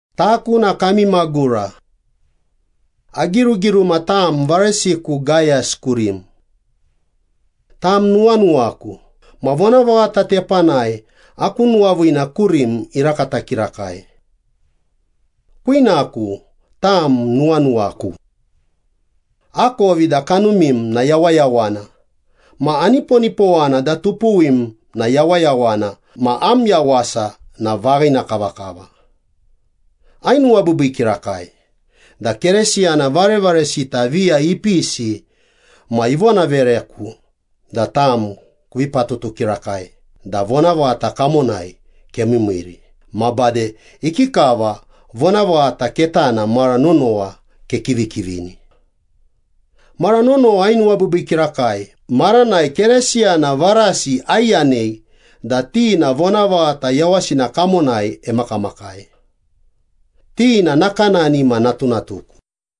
Taku na kami magura. Agirugiruma tam varesiku Gayas kurim. Tam nuwanuwaku, ma vonavaghata tepanai aku nuwaviina kurim irakata kirakai. Kwinaku, tam nuwanuwaku. Akovi da kanumim na yawayawana ma aniponipowana da tupuwim na yawayawana ma am yawasa na vaghina kavakava. Ainuwabiibii kirakai da Keresiyana varevaresita viya ipisi ma ivonavereku da tam kuvi patutu kirakai da vonavaghata kamonai kemiimiiri, ma bade ikikava vonavaghata ketana mara nonowa kekivikivini. Mara nonowa ainuwabiibii kirakai maranai Keresiyana varasi aiyanei da ti na vonavaghata yawasina kamonai emakamakai. Ti na nakanani ma natunatuku.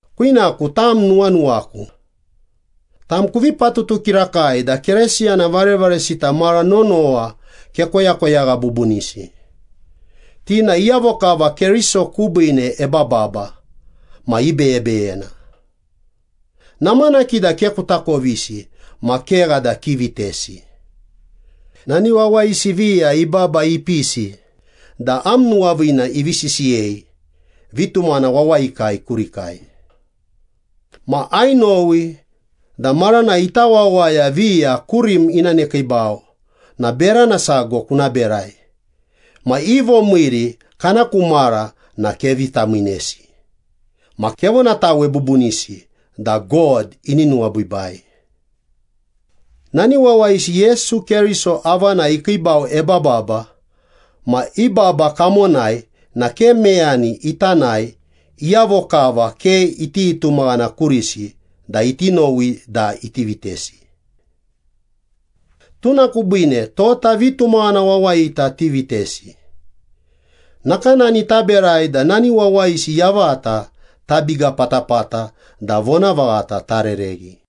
Kwinaku, tam nuwanuwaku. Tam kuvi patutu kirakai da Keresiyana varevaresita mara nonowa kekoyakoyagha bubunisi. Ti na iyavo kava Keriso kubiine ebababa ma ibeyebeyena. Namanaki da ke kutakovisi ma kegha da kivitesi. Nani wawayisi viya ibaba ipisi da am nuwaviina ivi sisiyei vitumaghana wawayikai kurikai. Ma ainowi da maranai ita wawaya viya kurim ina nekiibau na berana sago kuna berai ma i vomiiri kana ku mara na kevi tamiinesi ma kevonatawe bubunisi da God ini nuwabiibai. Nani wawayisi Yesu Keriso avanai ikiibau ebababa ma i baba kamonai na ke meyani ita nae iyavo kava ke iti tumaghana kurisi da iti nowi da iti vitesi. Tuna kubiine tota vitumaghana wawayita tivitesi. Nakanani taberai da nani wawayisi yavata tabiga patapata da vonavaghata tarereghi.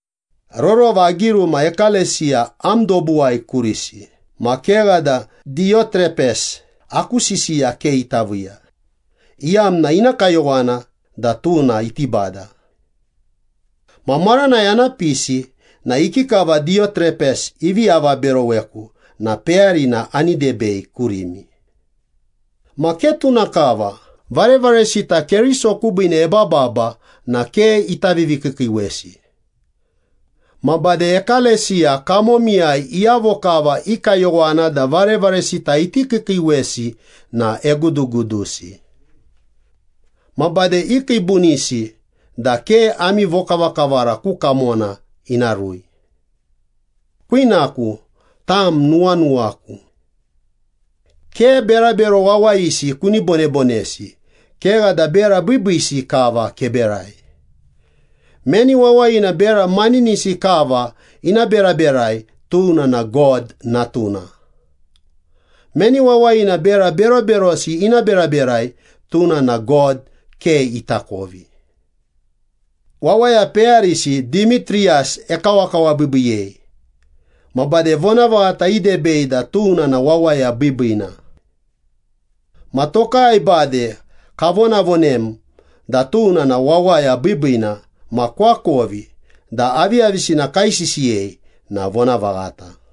Rorova agiruma ekalesiya am dobuwai kurisi, ma kegha da Diyotrepes aku sisiya ke ita viiya, iyamna ina kayowana da tuna iti bada. Ma maranai ana pisi na ikikava Diyotrepes ivi avaberoweku na peyarina ani debei kurimi. Ma ke tuna kava, varevaresita Keriso kubiine ebababa na ke ita vivikiikiiwesi. Ma bade ekalesiya kamomiyai iyavo kava i kayowana da varevaresita iti kiikiiwesi na egudugudusi. Ma bade ikiibunisi da ke ami vokavakavara ku kamona ina rui. Kwinaku, tam nuwanuwaku. Ke berabero wawayisi kuni bonebonesi, kegha da bera biibiisi kava keberai. Meni wawayina bera maninisi kava ina beraberai, tuna na God natuna. Meni wawayina bera beroberosi ina beraberai, tuna na God ke itakovi. Wawaya peyarisi Dimitriyas ekawakawabiibiiyei ma bade vonavaghata idebei da tuna na wawaya biibiina. Ma tokai bade kavonavonem da tuna na wawaya biibiina ma kuakovi da aviyavisina kaisisiyei na vonavaghata.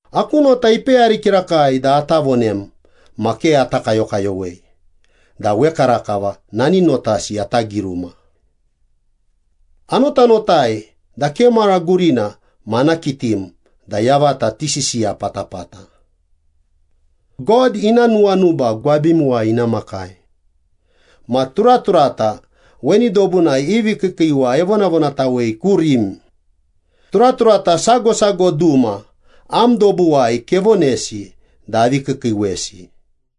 Aku nota ipeyari kirakai da ata vonem ma ke ata kayokayowei da wekarakava nani notasi ata giruma. Anotanotai da ke mara gurina ma ana kitim da yavata tisisiya patapata. God ina nuwanuba gwabimuwai ina makai. Ma turaturata weni dobunai i vikiikiiwa evonavonatawei kurim. Turaturata sago sago duma am dobuwai kevonesi da avi kiikiiwesi.